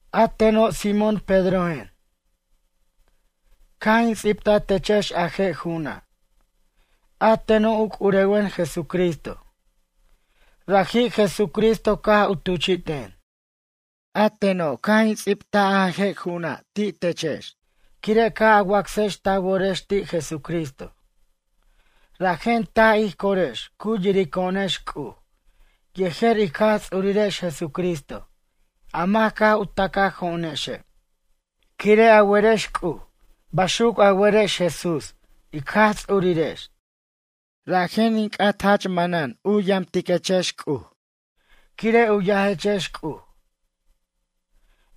A teno' Simón Pedrojen. Caj in ts'ibta techex a je' ju'una'. A teno' u c'urewen Jesucristo. Raji' Jesucristo caj u tuchi'ten. A teno' caj in ts'ibt a je' ju'una' techexa' quire' caj a wacsex ta worex ti' Jesucristo. Rajen taj ij corex cu yirico'onex C'uj yejer ic Jaj Ts'urex Jesucristo a mac caj u tacajo'onexe'. Quire' a werex C'uj, baxuc a werex Jesús ic Jaj Ts'urirex. Rajen in c'at jach manan u yamtiquechex C'uj, quire' u yajechex C'uj.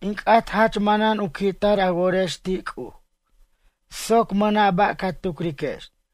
In c'at jach manan u qui'tar a worex ti' C'uj soc mʌna' ba' ca tucrex.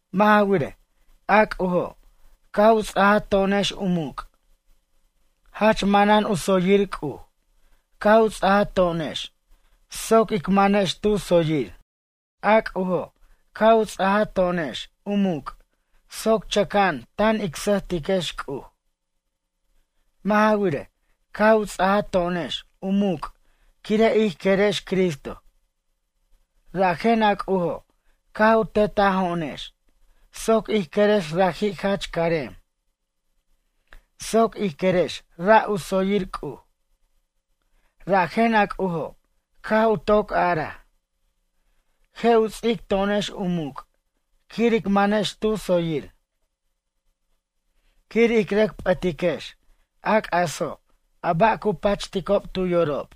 Mʌ' ja wirej, a C'ujo' caj u ts'aja to'onex u muc'. Jach manan u tsoyir C'uj caj u ts'aja to'onex soc ic manex tu tsoyir. A C'ujo' caj u ts'aja to'onex u muc' soc chʌca'an tan ic sʌjtiquex C'uj. Mʌ' ja wirej, caj u ts'aja to'onex u muc' quire' ij querex Cristo. Rajen a C'ujo' caj u tetajo'onex soc ij querex raji' jach carem. Soc ij querex ra' u tsoyir C'uj. Rajen a C'ujo' caj u toc araj: “Je' u ts'ic to'onex u muc' quir ic manex tu tsoyir. Quir ic rʌc p'ʌtiquex, a c'aso' a ba' cu pachiticob tu yorob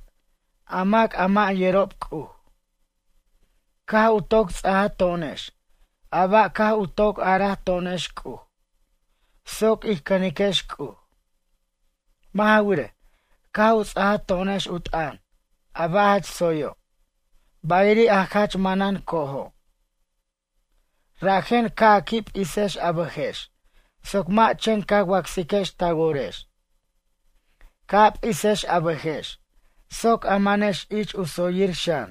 a mac a mʌ' yerob C'uj.” Caj u toc ts'aja to'onex a ba' caj u toc araj to'onex C'uj soc ij cʌniquex C'uj. Mʌ' ja wirej, caj u ts'aja to'onex u t'ʌn a ba' jach tsoyo' bayiri' a jach manan co'ojo'. Rajen ca' a qui' p'isex a bʌjex soc mʌ' chen ca wacsiquex ta worex. Ca' a p'isex a bʌjex soc a manex ich u tsoyir xan.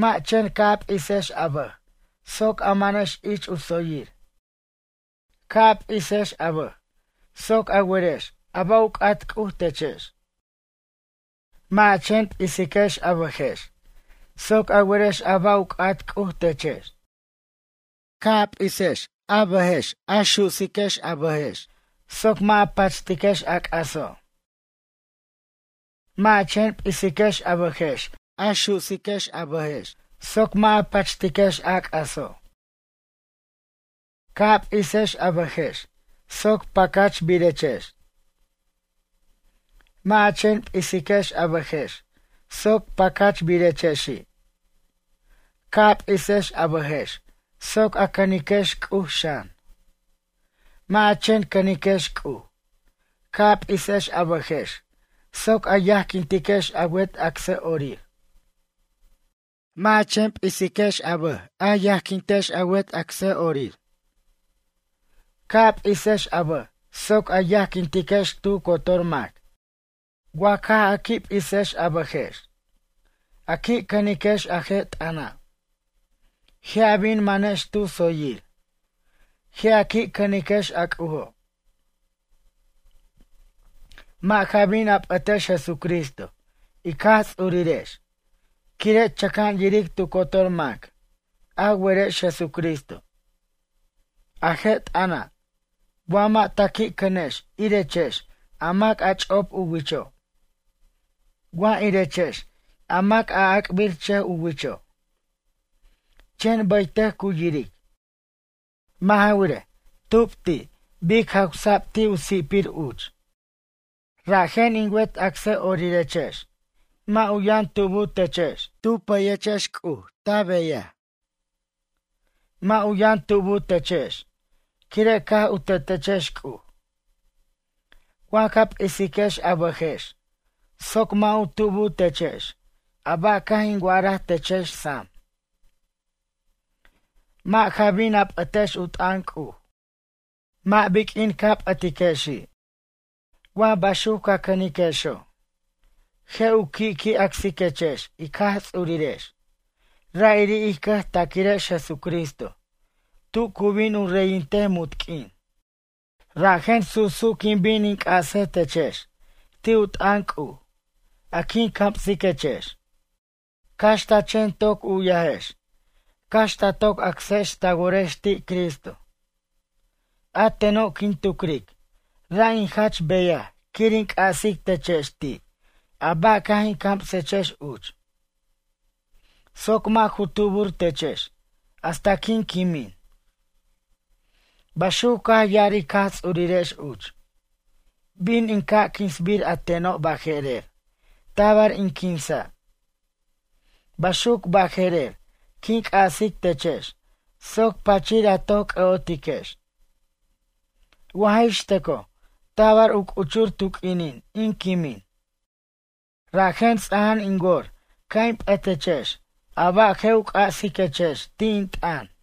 Mʌ' chen ca' a p'isex a bʌj soc a manex ich u tsoyir, ca' a p'isex a bʌj soc a werex a ba' u c'at C'uj techex. Mʌ' a chen p'isiquex a bʌjex soc a werex a ba' u c'at C'uj techex. Ca' a p'isex a bʌjex a su'siquex a bʌjex soc mʌ' a pachtiquex a c'aso'. Mʌ' a chen p'isiquex a bʌjex a su'siquex a bʌjex soc mʌ' a pachtiquex a c'aso'. Ca' a p'isex a bʌjex soc pacachbirechex. Mʌ' a chen p'isiquex a bʌjex soc pacachbirechexi'. Ca' a p'isex a bʌjex soc a cʌniquex C'uj xan. Mʌ' a chen cʌniquex C'uj. Ca' a p'isex a bʌjex soc a yajquintiquex a wet acsʌ'orir. Mʌ' a chen p'isiquex a bʌj a yajquintex a wet acsʌ'orir. Ca' a p'isiquex a bʌj soc a yajquintiquex tu cotor mac. Wa caj a qui' p'isex a bʌjex, a qui' cʌniquex a je' t'ʌna'. Je' a bin manex tu tsoyir. Je' a qui' cʌniquex a C'ujo'. Mʌ' ja bin a p'ʌtex Jesucristo ic Jaj Ts'urirex quire' chʌca'an yiric tu cotor mac a werex Jesucristo. A je' t'ʌna' wa mʌ' ta qui' cʌnex irechex a mac a ch'op u wicho'. Wa irechex a mac a ac'birchʌj u wicho', chen bʌytʌc cu yiric. Mʌ' ja wirej, tub ti' bic jawsa'b ti' u si'pir uch. Rajen in wet acsʌ'orirechex, mʌ' u yʌn tubu techex tu pʌyechex C'uj tu beyaj. Mʌ' u yʌn tubu techex quire' caj u tetechex C'uj. Wa ca p'isiquex a bʌjex soc mʌ' u tubu techex a ba' caj in wa'araj techex sam. Mʌ' ja bin a p'ʌtex u t'ʌn C'uj mʌ' biq'uin ca p'ʌtiquechi'. Wa baxuc ca cʌniquexo', je' u qui' qui' acsiquechex ic Jaj Ts'urirex ra'iri' ij cʌjtaquirex Jesucristo tu cu bin u reyintej munt q'uin. Rajen su'su' quin bin in c'ase techex ti' u t'ʌn C'uj, a quin camsiquechex. Cax ta chen toc u'yajex, cax ta toc acsex ta worex ti' Cristo. A teno' quin tucric ra' in jach beyaj quir in c'asic techex ti' a ba' caj in camsechex uch, soc mʌ' ju tubur techex hasta quin quimin. Baxuc caj ya'ar ic Jaj Ts'urirex uch. Bin in ca' quinsbir a teno' baje'rer, tabar in quinsa'. Baxuc baje'rer quin c'asic techex soc pachir a toc c'ʌ'otiquex. Wa jaj ix tʌcoj tabar u c'uchur tu q'uinin in quimin. Rajen ts'ajan in wor ca' in p'ʌtechex a ba' je' u c'asiquechex ti' in t'ʌn.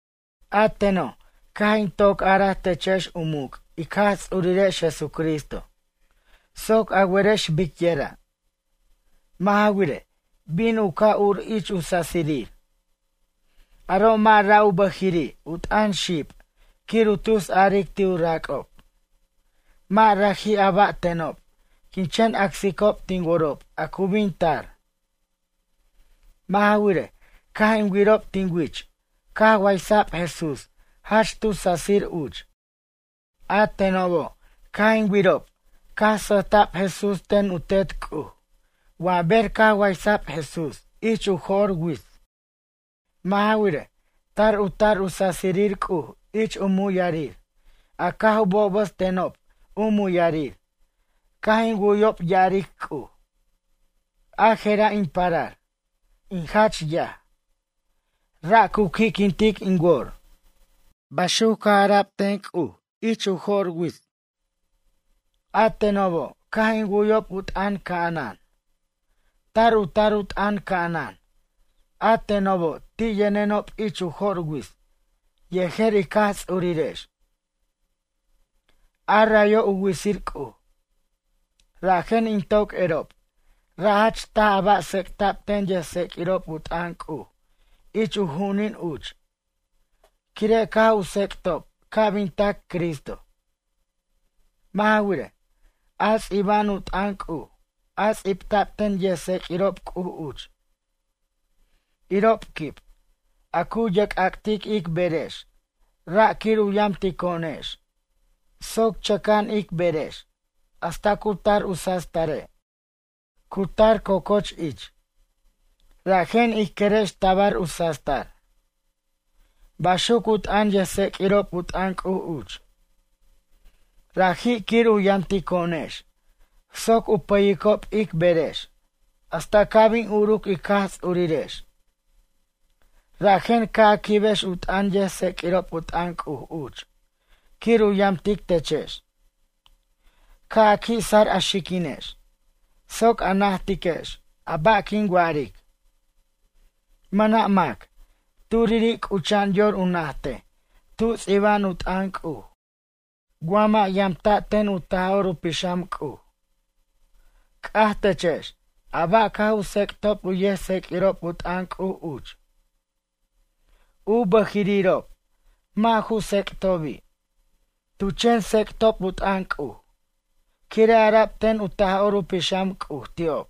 A teno' caj in toc araj techex u muc' ic Jaj Ts'urirex Jesucristo, soc a werex biquira'. Mʌ' ja wirej, bin u ca' ur ich u sasirir. Aro' mʌ' ra' u bʌjiri' u t'ʌn xib quir u tusaric ti' u rac'ob. Mʌ' raji' a ba' tenob quin chen acsicob tin worob a cu bin tar. Mʌ' ja wirej, caj in wirob tin wich caj waysa'b Jesús jach tu sasir uch. A tenobo' caj in wirob caj sʌjta'b Jesús ten u Tet C'uj wa ber caj waysa'b Jesús ich u jo'r wits. Mʌ' ja wirej, tar u tar u sasirir C'uj ich u muyarir a caj u bobʌst tenob u muyarir caj in wu'yob ya'aric C'uj: “A je'ra' in parar, in jach yaj. Ra' cu qui'quintic in wor.” Baxuc caj ara'b ten C'uj ich u jo'r wits. A tenobo' caj in wu'yob u t'ʌn ca'anan. Tar u tar u t'ʌn ca'anan a tenobo' ti' yʌnenob ich u jo'r wits yejer ic Jaj Ts'urirex. A rayo' u witsir C'uj. Rajen in toc erob, ra' jach taj a ba' tsec'ta'b ten yʌjtseq'uirob u t'ʌn C'uj ich u ju'unin uch, quire' caj u tsec'ob ca' bin tac Cristo. Mʌ' ja wirej, a ts'iba'an u t'ʌn C'uj a ts'ibta'b ten yʌjtseq'uirob C'uj uch, irob quib, a cu yerc'ac'tic ic berex ra' quir u yamtico'onex soc chʌca'an ic berex hasta cu tar u sastare' cu tar co'coch ich. Rajen ij querex tabar u sastar. Baxuc u t'ʌn yʌjtseq'uirob u t'ʌn C'uj uch. Raji' quir u yamtico'onex soc u pʌyicob ic berex hasta ca' bin uruc ic Jaj Ts'urirex. Rajen ca' a quibex u t'ʌn yʌjtseq'uirob u t'ʌn C'uj uch quir u yamtic techex. Ca' a qui' sar a xiquinex soc a najtiquex a ba' quin wa'aric. Mʌna' mac, turiri' c'ucha'an yor u najtej tu ts'iba'an u t'ʌn C'uj wa mʌ' yamta' ten u Taj'or u Pixam C'uj. C'aj techex a ba' caj u tsec'tob u yʌjtseq'uirob u t'ʌn C'uj uch, u bʌjirirob mʌ' ju tsec'tobi'. Tu chen tsec'tob u t'ʌn C'uj, quire' ara'b ten u Taj'or u Pixam C'uj ti'ob.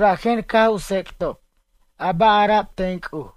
Rajen caj u tsec'tob a ba' ara'b ten C'uj.